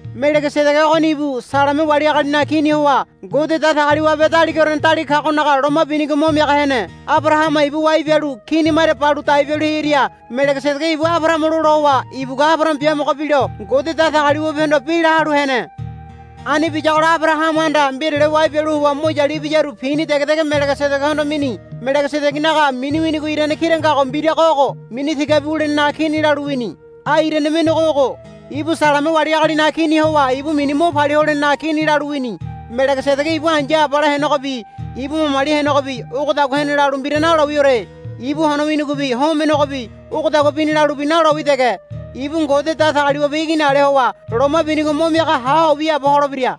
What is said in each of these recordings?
Melegesedege ogoni ibu Saleme wali agalinaga kini howa Ngode Datagaliwabe Daligaorene Daliga kagonaga loma binigo mo miaga hene. Abarahama ibu wai bialu kini maria balu dai bialu hearia Melegesedege ibu Abarahama lola howa ibugua Abarahama biamogo bilo Ngode Datagaliwabehondo bi lahalu hene. Ani biyagola Abarahamahanda mbirale wai bialu howa mo yalu ibiyaru pini dege dege Melegesedegehondo mini. Melegesedegenaga mini winigo irane kira ngago mbirago ogo, Mini Tigabi Wulenenaga Kini, lalu wini. Ai irane mendego ogo, Ibu Saleme wali agalinaga kini howa ibu mini Mo Palia Holenenaga Kini, lalu wini. Melegesedege ibu ai̱ya abala henegobi ibu mamali henegobi ogodagua hene lalu mbira nalowiore. Ibu hono winigobi homenegobi ogodagua bini lalubi nalowi dege. Ibu Ngode Datagaliwabe Igini ale howa loma binigo mo miaga haho wiaabo holebira.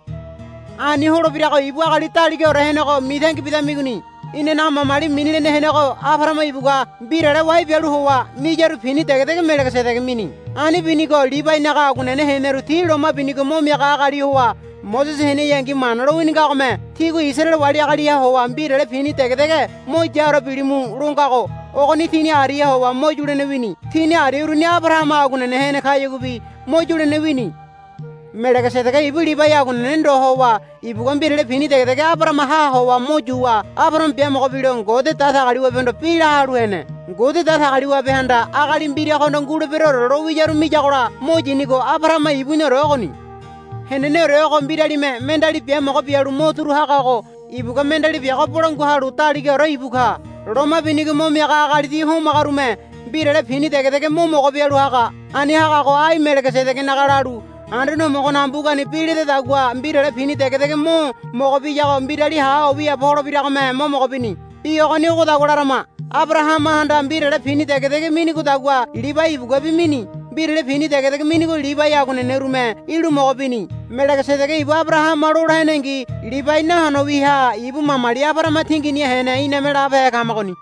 Ani holebirago ibu agali daligaore henego mitangi bidamigoni. Inanaga mamali mini lene henego Abarahama ibugua mbirale wai bialu howa miyaru pini dege dege Melegesedege mini. Ani binigo Libainaga aguanene heneru ti loma binigo mo miaga agali howa Mosese heneyangi Mana lowini ngagome, Tígua Isaraele wali agaliha howa mbirale pini dege dege mo yaore bilimu, lo ngago ogoni tini ariaha howa mo yulene wini. Tini aria uruni Abarahama aguanene hene kayaguabi mo yulene wini. Melegesedege ibu Libai aguanene ndo howa ibugua mbirale pini dege dege Abarahamaha howa mo yuwa Abarahama biamogo bilo Ngode Datagaliwabehondo bi lahalu hene. Ngode Datagaliwabehanda agali mbiragohondo, Nguleberoore, lowiyaru miyagola mo yinigo Abarahama ibuniore ogoni. Heneneore ogo mbiralime mendeali biamogo bialu mo turu hagago ibugua mendeali biago bolangua halu daligaore ibu ka. Loma binigo mo miaga agali ti homagarume mbirale pini dege dege mo mogo bialu haga. Ani hagago ai Melegesedegenaga lalu Anduane Homogonaga mbugani bi ledadagua mbirale pini dege dege mo mogo biyago mbirali haho wiaabo holebiragome mo mogo bini. Bi ogoni ogodagua larama. Abarahamahanda mbirale pini dege dege minigodagua Libai ibuguabi mini. Mbirale pini dege dege minigo Libai aguanenerume ilu mogo bini. Melegesedege ibu Abarahama lola henengi Libai nahono wiaha ibu mamali Abarahama tinginiha hene iname labehe kamagoni.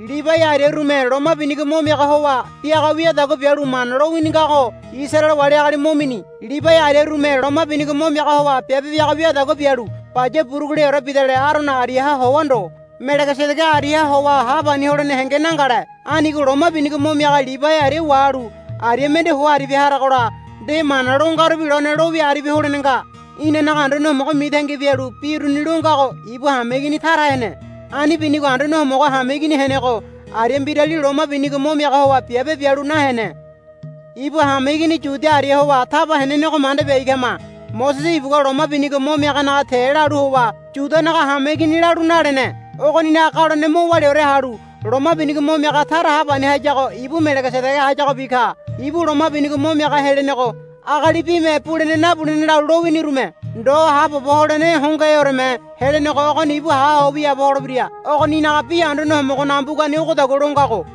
Libai ariarume loma binigo mo miaga howa biaga wiadagua bialu Mana lowini ngago Isaraele wali agali mo mini. Libai ariarume loma binigo mo miaga howa biabe biaga wiadagua bialu baya buruguleore bidale Arono ariaha howa ndo Melegesedege ariaha howa hapani holene henge nangale. Anigo loma binigo mo miaga Libai aria wahalu aria mende ho aribia haragola nde mana lo ngarubi lone lowia aribia holene nga. Inanaga Anduane Homogo mitangi bialu bi uruni longago ibu hameigini tara hene. Ani binigo Anduane Homogo hameigini henego aria mbirali loma binigo mo miaga howa biabe bialu nahene. Ibu hameigini Yuda aria howa taba henenego manda biai kama. Mosese ibugua loma binigo mo miaganaga te lalu howa Yudanaga hameigini lalu nalene. Ogoninaga galone mo waliaore halu loma binigo mo miaga tara hapani hayago ibu Melegesedege hayagobi ka. Ibu loma binigo mo miaga helenego agali bime bulene nabulene lalu lowinirume ndo haabobo holene hongoheoreme helenego ogoni ibu haho wiaabo holebira. Ogoninaga bi Anduane Homogonaga mbugani ogodagua longago,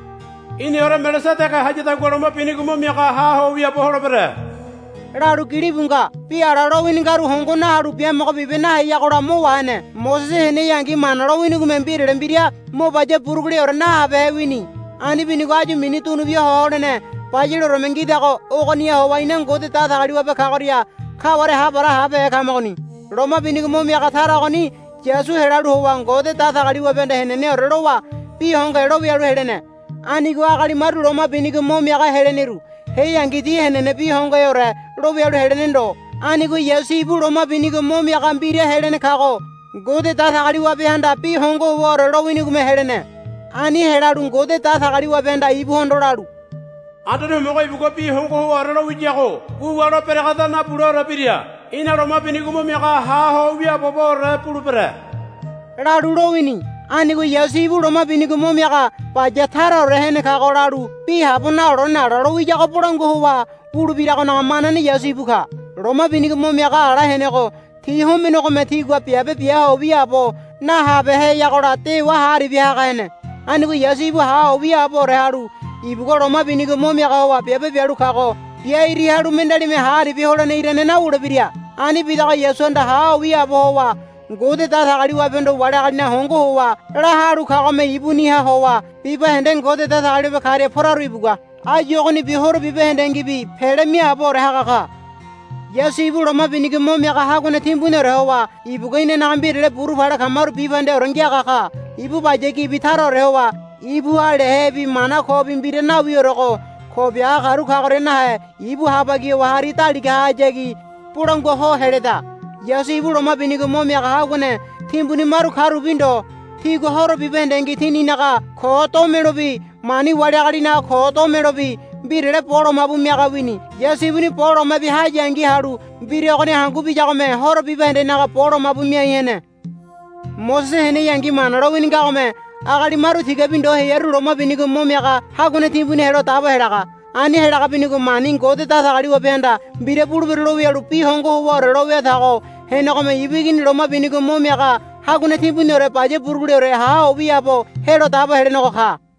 Í̠niore Melegesedege hayadagua loma binigo mo miaga ha ho wiaabo holebere, lalu gilibu nga. Bi ala lowini ngaru hongo nahalu biamogo bibe naheyagola mo wahene. Mosese heneyangi Mana lowinigome mbirale mbira mo baya buruguleore nahabehe wini. Ani binigo áyu mini dunubia ho holene bayaleoreme ngidago ogoniha howa ina Ngode Datagaliwabe kagoria kaware hapara habehe kamagoni. Loma binigo mo miaga tara ogoni Yasu helalu howa Ngode Datagaliwabehanda heneneore lowa bi hongohe lowialu helene. Anigo agali maru loma binigo mo miaga heleneru heangi ti henene bi hongoheore lowialu helene ndo. Anigo Yasu ibu loma binigo mo miaga mbira helene kago Ngode Datagaliwabehanda bi hongo howaore lowinigome helene. Ani helalu Ngode Datagaliwabehanda ibuhondo lalu, Anduane Homogo ibugua bi hongo howaore lowiyago wuwa lo beregeda nabuleore bira. Í̠na loma binigo mo miaga ha ho wiaaboboore bulebere, lalu lowini. Anigo Yasu ibu loma binigo mo miaga baya taraore hene kago lalu bi habo nalolene ala lowiyago bolangua howa wulebiragonaga manane Yasu ibu ka. Loma binigo mo miaga ala henego ti homenegome tigua biabe bia ho wiaabo nahabeheyagola dewa ha aribia haga hene. Anigo Yasu ibu ha ho wiaaboore halu ibugua loma binigo mo miaga howa biabe bialu kago biairi halu mendealime ha aribia holene irane nawulebira. Ani bidago Yasuhanda ha ho wiaabo howa Ngode Datagaliwabehondo wali agalinaga hongo howa lahalu kagome ibuniha howa bibahende Ngode Datagaliwabe karia poraru ibugua áyu ogonibi horo bibahendengibi pele miaaboore haga ka. Yasu ibu Loma Binigo Mo Miaga Haguane Timbuniore howa ibugua inanaga mbirale buru pale kamaru bibahendeore ngiaga ka. Ibu baya gibi taraore howa ibuha lehebi mana kobi mbira nawiorego ko biaga karu kagoria nahe ibu habagi howa hari daligahayagi bolangua ho heleda. Yasu ibu loma binigo mo miaga haguane timbuni maru karubi ndo. Tigua horo bibahendengi tininaga ko domelobi mani wali agalinaga ko domelobi mbirale bo lomabu miaga wini. Yasu ibuni bo loma bia hayangi halu mbira ogoni hangu biyagome horo bibahendenaga bo lomabu miai hene. Mosese heneyangi Mana lowini ngagome agali maru tigabi ndo hearu loma binigo mo miaga haguane timbuni helo dabo helaga. Ani helaga binigo mani Ngode Datagaliwabehanda, Mbira bulebero, lo wialu bi hongo howaore lo wiatago henegome ibu Igini loma binigo mo miaga Haguane Timbuniore baya buruguleore ha ho wiaabo helo dabo helenego ka.